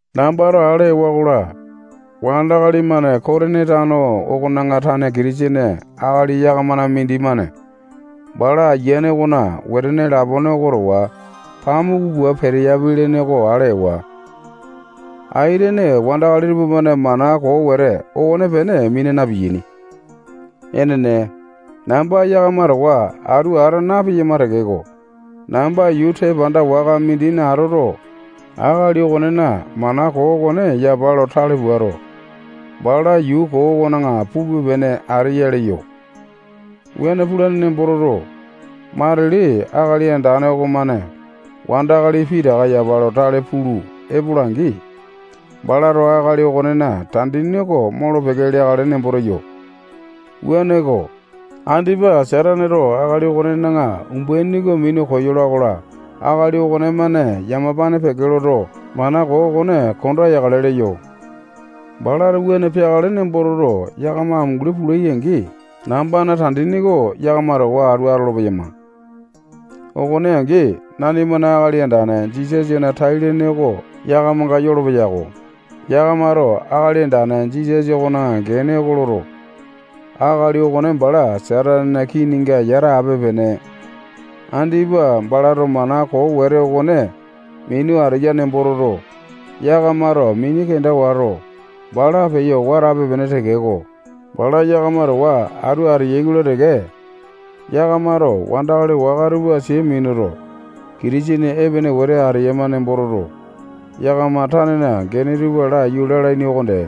Nambato ale ewa-kola, wandakali-mane Kotini tano okona tane Kitisene akali yakamana mindimane bala ayiane okona wetene lapone oko towa pamuku pua peteyapi ale ewa. Aitene wandakali tupamane mana koo wete okonepene mina na-piyaini. Enene, namba yakama towa atu ata napeyama tekeko, namba yuu tepanda waka mindina atoto, akali okonena mana koo okone yapa lo tale puato, bala yuu koo okona pupe-pene ateya leyo. Wuane pulane nembo toto, matili Akali Andane okomane wandakali pitaka yapa lo tale pulu epola-angi, balato akali okonena tandini oko molo-peke leakale nembo teyo. Wuaneko, andipa Sataneto akali okonena umbaini oko minu koyola-kola, akali okonemane yamapane peke loto, mana koo okone konda yakale leyo. Balato wuane peakale nembo toto, yakama amunguli pulai-angi, nambana tandini oko yakama towa atu atolo-peyama. Okone angi, nanimana Akali Andane Jisasana tai-lene oko yakamanga yolopeya-ko. Yakamato Akali Andane Jisasa okona gene oko loto, akali okone bala Satanena kininga yata ape-pene. Andipa balato mana koo wete okone minu ateya nembo toto, yakamato mini kenda wato, bala peyo watape-pene tekeko, bala yakama towa atu ateyai-kola teke, yakamato wandakali waka tupa sia minuto, Kitisene epene wete eyama nembo toto, yakama tanena gene tupa laiyu lalaini okonde.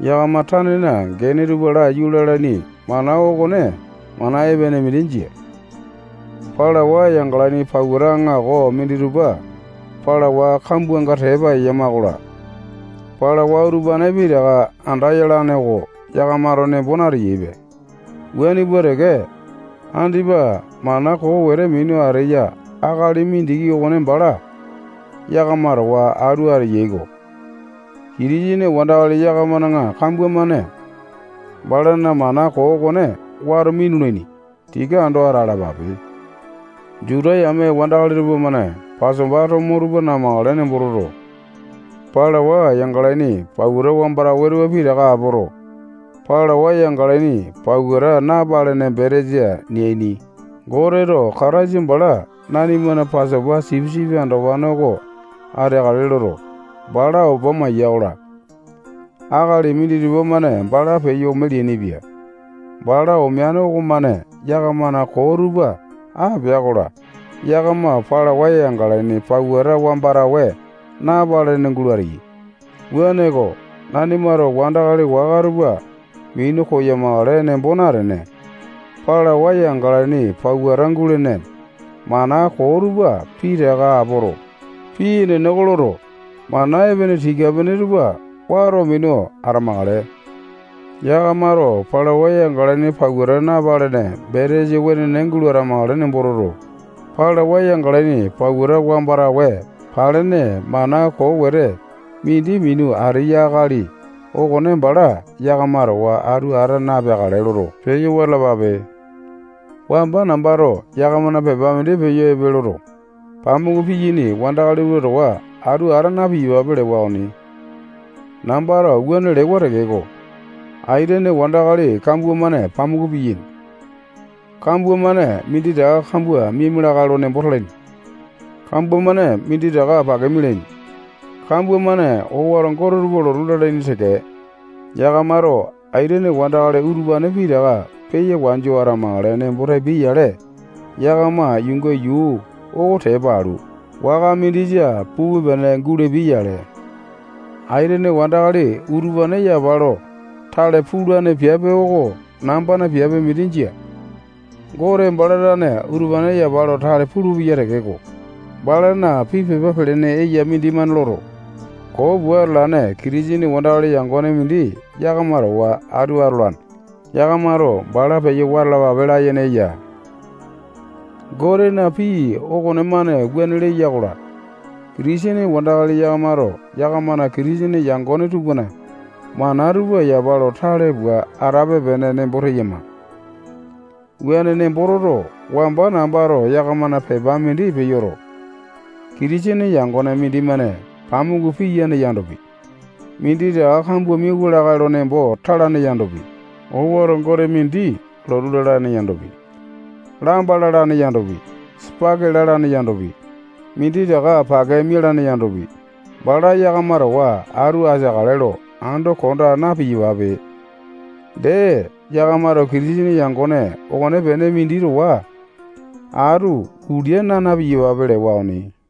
Yakama tanena gene tupa laiyu lalaini mana okone mana epene mindi jia. Palawa yangalaini pauta aŋako minditupa palawa kambuanga tepa eyama-kola, palawa utupane pitaka anda yalane oko yakamato nembo nateyaipe. Wuane pua teke, andipa mana koo wete minu ateya akali mindiki okone bala yakama towa atu ateyai-ko. Kitisene wandakali yakamana kambua-mane balana mana koo okone wato minulaini. Tika ando atalapape. Juta yame wandakali tupamane Pasopa tomo tupa namakale nembo toto, palawa yangalaini pauta wamba tawe tupa pitaka apoto, palwawa yangalaini pauta napalene betesa neaini. Goteto Kataisa bala nanimana Pasopa sipisipi andopane oko ateakale loto, bala opa maiya-kola, akali minditupa-mane bala peyo ome leainipia. Bala omeane okomane yakamana koo tupa apea-kola, yakama palawa yangalaini pauta wamba tawe napalene gulo ateyai. Wuaneko, nanimato wandakali waka tupa minu koyamakale nembo natene, palawa yangalaini pauta gulene mana koo tupa pitaka apoto, pii enene oko loto, mana epene tika-pene tupa wato minu atamakale. Yakamato palawa yangalaini pauta napalene betesa wenene gulo atamakale nembo toto, palawa yangalaini pauta wamba tawe palene mana koo wete mindi minu ateya akali okone bala yakama towa atu ata napeakale loto, peyo wata alapape. Wamba nambato yakamana pepa mindi peyo epe loto, pamuku piyaini wandakali tupa towa atu ata na-piyapape lewa okoni. Nambato wuane lewa tekeko, aitene wandakali kambua-mane pamuku piyaini. Kambua-mane minditaka kambua miaima lakae lo nembo talaini. Kambua-mane minditaka pake mialaini. Kambua-mane owato gote tupa lotu lalaini teke. Yakamato aitene wandakali utupane pitaka peya wanju atamakale nembo tapia-yale, yakama yuunga yuu oko tepa alu, waka mindisa pupe-pene gulapia-yale. Aitene wandakali utupane yapa lo tale pulane piape oko nambana piape mindi jia. Gote bala tane utupane yapa lo tale pulupeya tekeko, balana pii pepa pelene eya mindimane loto, koo pua atalane Kitisene wandakali yangone mindi yakama towa atu atolane. Yakamato bala peyo wata alapape layene eya. Gotena pii okonemane wuane leya-kola, Kitisene wandakali yakamato yakamana Kitisene yangone tupana mana tupa yapa lo tale pua atape-pene nembo teyama. Wuane nembo toto, wamba nambato yakamana pepa mindi peyoto, Kitisene yangone mindimane pamuku piyane yandopi, minditaka kambua miawua lakae lo nembo talane yandopi, owato gote mindi lotu lalane yandopi, lamba lalane yandopi, sipaki lalane yandopi, minditaka pake mialane yandopi, bala yakama towa atu ateakale lo ando konda na-piyapape. Dee, yakamato Kitisene yangone okonepene mindi towa atu ulia naa na-piyapape lewa okoni.